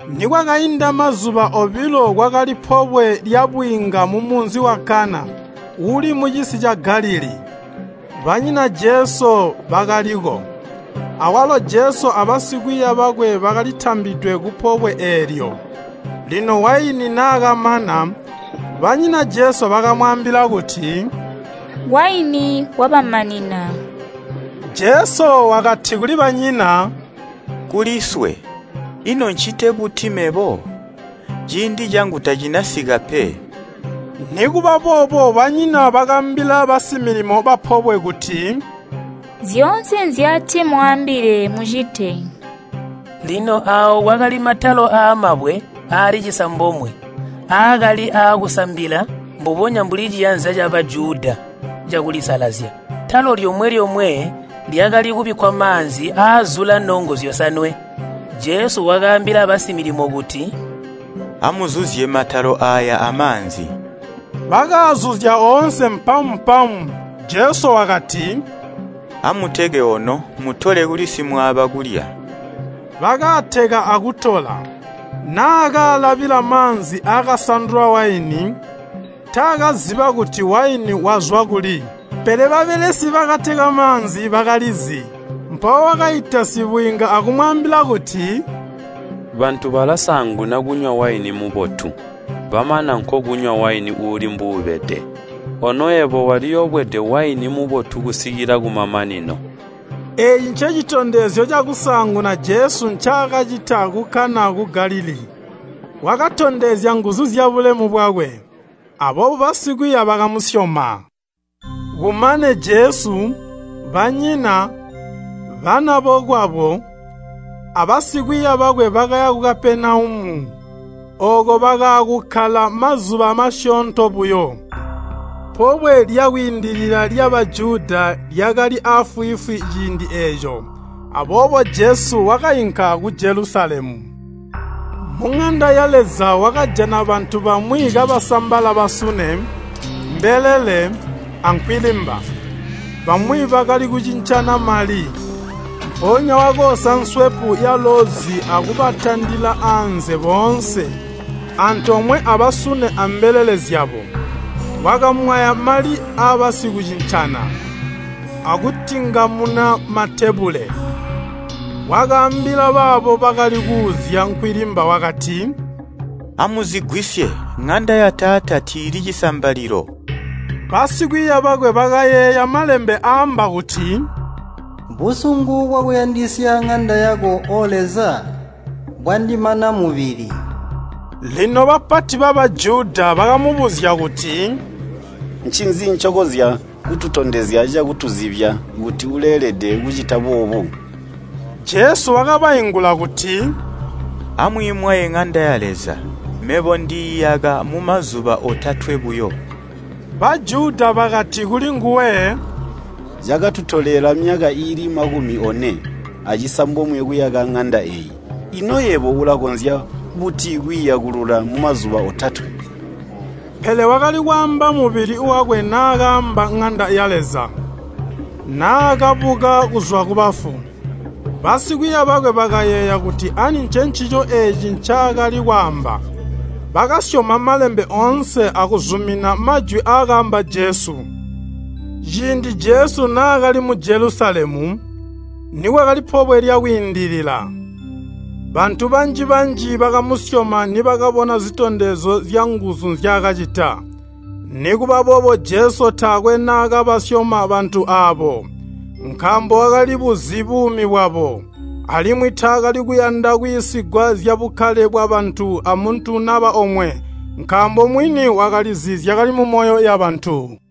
Nikwakainda mazuba obilo kwakali pobwe lyabwiinga mumunzi wa Kana uuli mucisi ca Galilii, banyina Jesu bakaliko. Awalo Jesu abasikwiiya bakwe bakalitambidwe kupobwe eelyo. Lino waini naakamana, banyina Jesu bakamwaambila kuti, “Waini wabamanina.” Jesu wakati kuli banyina, “Kuliswe, ino ncite buti mebo? Ciindi cangu tacinasika pe.” Nikuba boobo banyina bakaambila basimilimo bapobwe kuti, “Zyoonse nzyatimwaambile mucite.” Lino aawo kwakali matalo aamabwe aali cisambomwe aakali aakusambila mbubonya mbuli ciyanza ca Bajuda cakulisalazya. Talo lyomwe-lyomwe lyakali kubikkwa maanzi aazula nongo zyosanwe. Jesu wakaambila basimilimo kuti, “Amuzuzye matalo aaya amaanzi.” Bakaazuzya oonse mpamu-mpamu. Jesu wakati, “Amuteke ono, mutole kuli simwaaba kulya.” Bakateka akutola. Naakaalabila maanzi akasandulwa waini, taakaziba kuti waini wazwa kuli. (Pele babelesi bakateka maanzi bakalizi.) Mpawo wakaita sibwiinga akumwaambila kuti, “Bantu balasaanguna kunywa waini mubotu, bamana nkokunywa waini uuli mbuubede. Ono yebo waliyobwede waini mubotu kusikila kumamanino.” Eeci ncecitondezyo cakusaanguna Jesu ncaakacita ku Kana ku Galilii, wakatondezya nguzu zyabulemu bwakwe, aboobo basikwiiya bakamusyoma. Kumane Jesu, banyina, banabokwabo, abasikwiiya bakwe bakaya ku Kapenaumu. Ooko bakaakukkala mazuba masyoonto buyo. Pobwe lya Kwiindilila lya Bajuda lyakali afwiifwi ciindi eeco, aboobo Jesu wakainka ku Jelusalemu. Muŋanda ya Leza wakajana bantu bamwi kabasambala basune, mbelele, ankwilimba. Bamwi bakali kucincana mali. Mpoonya wakoosa nswepu yaloozi akubatandila anze boonse, antoomwe abasune ambelele zyabo. Wakamwaya mali abasikucincana, akutingamuna matebule. Wakaambila baabo bakali kuuzya nkwilimba wakati, “Amuzigwisye! Ŋanda ya Taata tiili cisambalilo!” Basikwiiya bakwe bakayeeya malembe aamba kuti, “Busungu bwakuyandisya ŋanda yako O Leza, bwandimana mubili.” Lino bapati ba Bajuda bakamubuzya kuti, “Ncinzi ncokonzya kututondezya cakutuzibya kuti uleelede kucita boobu?” Jesu wakabaingula kuti, “Amwiimwaye ŋanda ya Leza, mebo ndiiyaka mumazuba otatwe buyo.” Bajuda bakati kulinguwe, “Cakatutolela myaka iili makumi one acisambomwe kuyaka ŋanda eeyi, ino yebo ulakonzya buti kwiiyakulula mumazuba otatwe?” Pele wakali kwaamba mubili wakwe naakaamba ŋanda ya Leza. Naakabuka kuzwa kubafu, basikwiiya bakwe bakayeeya kuti ani ncencico eeci ncaakali kwaamba. Bakaasyoma Malembe oonse akuzumina majwi aakaamba Jesu. Ciindi Jesu naakali mu Jelusalemu, nikwakali Pobwe lya Kwiindilila, bantu banji-banji bakamusyoma nibakabona zitondezyo zyanguzu nzyaakacita. Nikuba boobo Jesu taakwe naakabasyoma bantu aabo, nkaambo wakalibuzi buumi bwabo. Alimwi taakali kuyanda kwiisigwa zyabukkale bwabantu amuntu naba omwe, nkaambo mwini wakalizi zyakali mumyoyo yabantu.